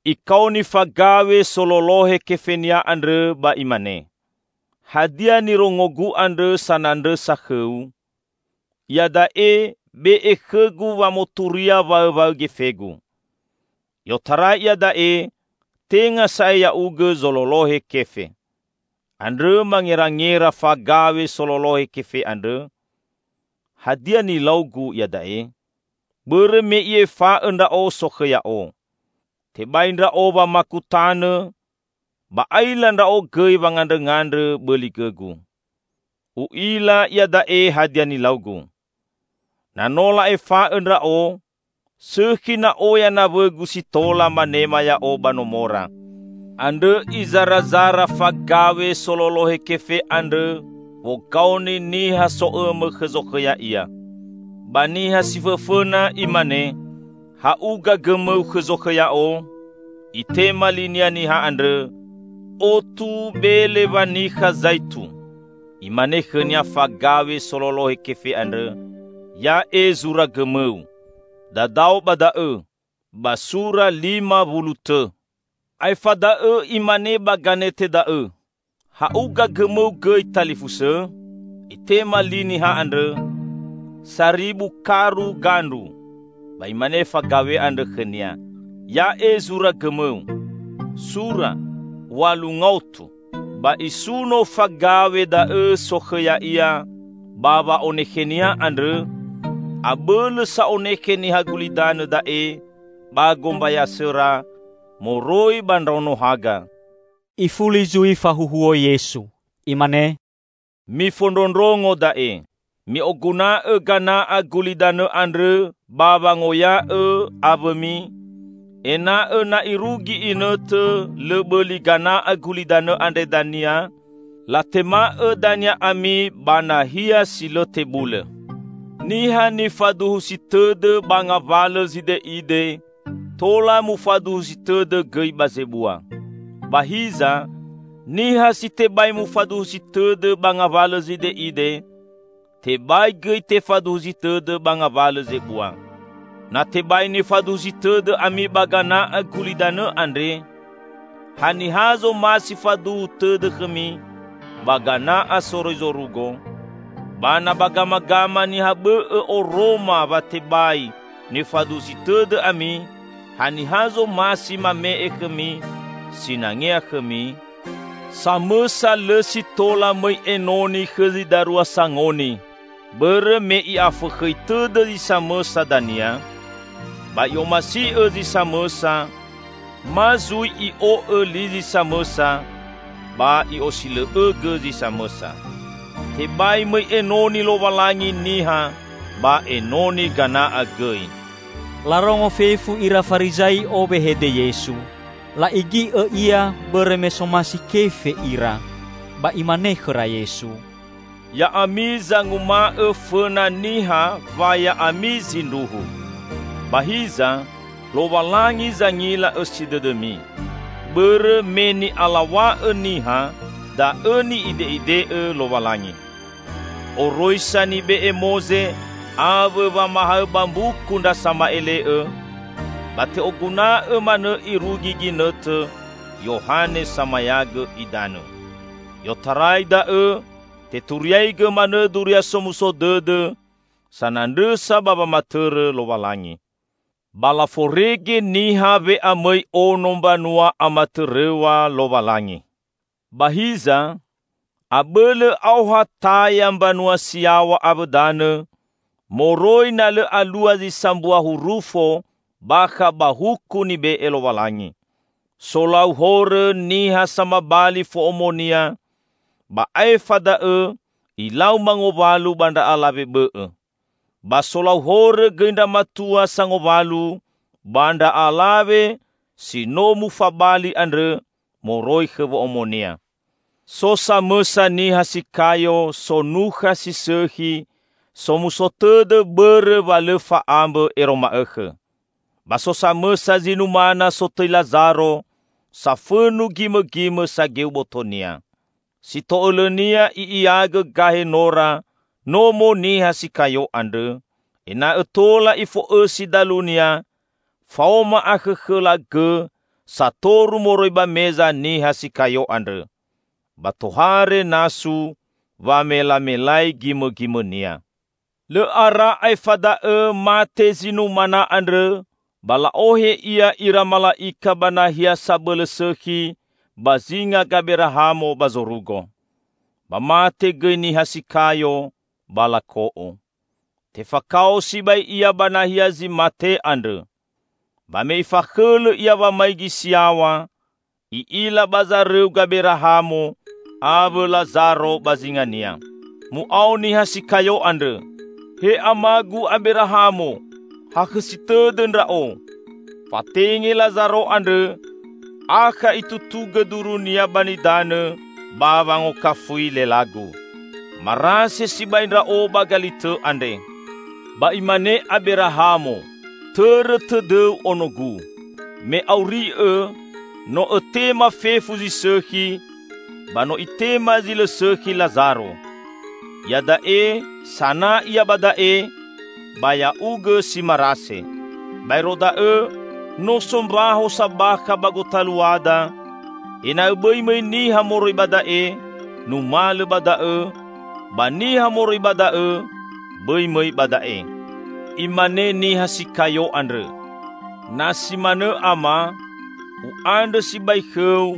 Ikaoni fagaw̃e sololohe kefenia andrõ ba imane, 'Hadia nirongogu andrõ sanandrõsa khõu? Iada'e, be'e khõgu wamoturia waõwaõ gefegu. I'otarai iada'e tenga sa'ae ya'ugõ zololohe kefe.' Andrõ mangerangera fagaw̃e sololohe kefe andrõ, 'Hadia nilaugu iada'e? Bõrõ me i'efa'õ ndra'o sokhõ ya'o. Tebai ndra'o wamaku tanõ, ba aila ndra'o gõi wangandrõngandrõ bõli gõgu. U'ila iada'e hadia nilaugu. Na no la'efa'õ ndra'o, sõkhi na oya nawõgu si tola manema ya'o ba nomora!' Andrõ izarazara fagaw̃e sololohe kefe andrõ wogaoni niha so'õmõ khõ zokhõ ya'ia. Ba niha si fõfõna imane, 'Ha'uga gõmõu khõ zokhõ ya'o?' Itema linia niha andrõ, 'Otu bele wanikha zaitu!' Imane khõnia fagaw̃e sololohe kefe andrõ, 'Ya'e zura gõmõu. Dadao ba da'õ: ba sura lima wulu tõ.' Aefa da'õ imane ba ganete da'õ, 'Ha'uga gõmõu gõi, talifusõ?' Itema li niha andrõ, 'Saribu karu gandru!' Ba imane fagaw̃e andrõ khõnia, 'Ya'e zura gõmõu. Sura: w̃alu ngaotu!' Ba isuno fagaw̃e da'õ sokhõ ya'ia ba wa'onekhenia andrõ, abõlõ sa onekhe niha gulidanõ da'e ba gombayasõra moroi ba ndraono haga." Ifuli zui fahuhuo Yesu. Imane, "Mifondrondrongo da'e: mi'oguna'õ gana'a gulidanõ andrõ ba wangoya'õ awõmi, ena'õ na irugi inõtõ lõ bõli gana'a gulidanõ andre dania, latema'õ dania ami ba nahia si lõ tebulõ. Niha nifaduhusi tõdõ ba ngawalõ zide'ide, tola mufaduhusi tõdõ gõi ba zebua. Ba hiza niha si tebai mufaduhusi tõdõ ba ngawalõ zide'ide, tebai gõi tefaduhusi tõdõ ba ngawalõ zebua. Na tebai nifaduhusi tõdõ ami ba gana'a gulidanõ andre, haniha zomasi faduhu tõdõ khõmi ba gana'a soroi zorugo? Ba na ba gamagama niha bõ'õ oroma wa tebai nifaduhusi tõdõ ami, haniha zomasi mame'e khõmi sinangea khõmi? Samõsa lõ si tola mõi enoni khõ zi darua sangoni; bõrõ me i'afõkhõi tõdõ zi samõsa dania, ba i'omasi'õ zi samõsa, ma zui i'o'õ li zi samõsa ba i'osilõ'õgõ zi samõsa. Tebai mõi enoni Lowalangi niha ba enoni gana'a gõi." Larongo fefu ira Farizai'o wehede Yesu. La'igi'õ Ia bõrõ me somasi kefe ira. Ba Imane khõra Yesu, "Ya'ami zanguma'õ fõna niha wa ya'ami zindruhu. Ba hiza, Lowalangi zangila õsi dõdõmi. Bõrõ me ni'alaw̃a'õ niha, da'õ ni'ide'ide'õ Lowalangi. Oroisa nibe'e Moze awõ wamahaõ ba mbuku ndra sama'ele'õ, ba te'oguna'õ manõ irugi ginõtõ Yohane Samayagõ Idanõ. I'otarai da'õ teturiaigõ manõ Duria Somuso Dõdõ sanandrõsa ba wamatõrõ Lowalangi. Ba laforege niha we'amõi Ono mbanua amatõrõw̃a Lowalangi. Ba hiza, abõlõ aoha taya mbanua si yaw̃a awõ danõ, moroi na lõ alua zi sambua hurufo bakha ba Huku nibe'e Lowalangi. Solau horõ niha samabali fo'omonia ba aefa da'õ ilau mangowalu ba ndra alawe bõ'õ. Ba solau horõ gõi ndra matua sangowalu ba ndra alawe si no mufabali andrõ moroi khõ wo'omonia." "So samõsa niha si kayo, sonukha si sõkhi, somuso tõdõ bõrõ wa lõ fa'ambõ ero ma'õkhõ. Ba so samõsa zi numana sotõi Lazaro, safõnu gimõgimõ sageu botonia. Si to'õlõnia i'iagõ gahe nora nomo niha si kayo andrõ, ena'õ tola ifo'õsi dalunia faoma akhõkhõla gõ satoru moroi ba meza niha si kayo andrõ. Ba tohare nasu wamelamelai gimõgimõnia. Lõ ara aefa da'õ mate zi numana andrõ ba la'ohe ia ira mala'ika ba nahia sabõlõ sõkhi ba zinga Gaberahamo ba zorugo. Ba mate gõi niha si kayo, ba lako'o. Tefakao sibai ia ba nahia zi mate andrõ. Ba me ifakhõlõ ia wamaigi si yaw̃a, i'ila ba zarõu Gaberahamo awõ Lazaro ba zingania. Mu'ao niha si kayo andrõ, 'He Amagu Aberahamo! Hakhõsi tõdõ ndra'o. Fatenge Lazaro andrõ akha itutugõ durunia ba nidanõ ba wangokafui lelagu. Marase sibai ndra'o ba galitõ andre!' Ba imane Aberahamo, 'Tõrõ tõdõu onogu: me auri'õ, no õtema fefu zi sõkhi, ba no itema zi lõ sõkhi Lazaro. Iada'e sana ia ba da'e, ba ya'ugõ si marase. Baero da'õ, no so mbaho sabakha ba gotaluada, ena'õ bõi mõi niha moroi ba da'e numalõ ba da'õ ba niha moroi ba da'õ bõi mõi ba da'e!' Imane niha si kayo andrõ, 'Na si manõ Ama, u'andrõ sibai khõu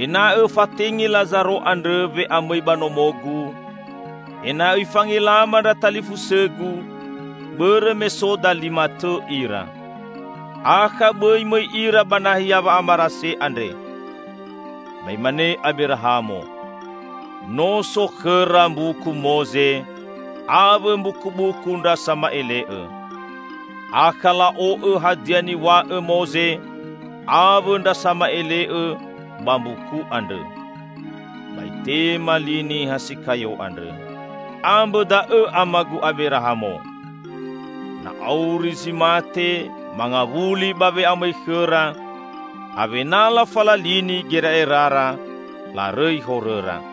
ena'õ õfatenge Lazaro andrõ we'amõi ba nomogu, ena'õ ifangelama ndra talifusõgu, bõrõ me so dalima tõ ira. Akha bõi mõi ira ba nahia wa'amarase andre!' Ba imane Aberahamo, 'No so khõra mbuku Moze awõ mbukubuku ndra sama'ele'õ! Akha la'o'õ hadia niw̃a'õ Moze awõ ndra sama'ele'õ ba mbuku andrõ!' Ba itema li niha si kayo andrõ, 'Ambõ da'õ Amagu Aberahamo. Na auri zi mate mangawuli ba we'amõi khõra, awena lafalalini gera'erara larõi horõra.'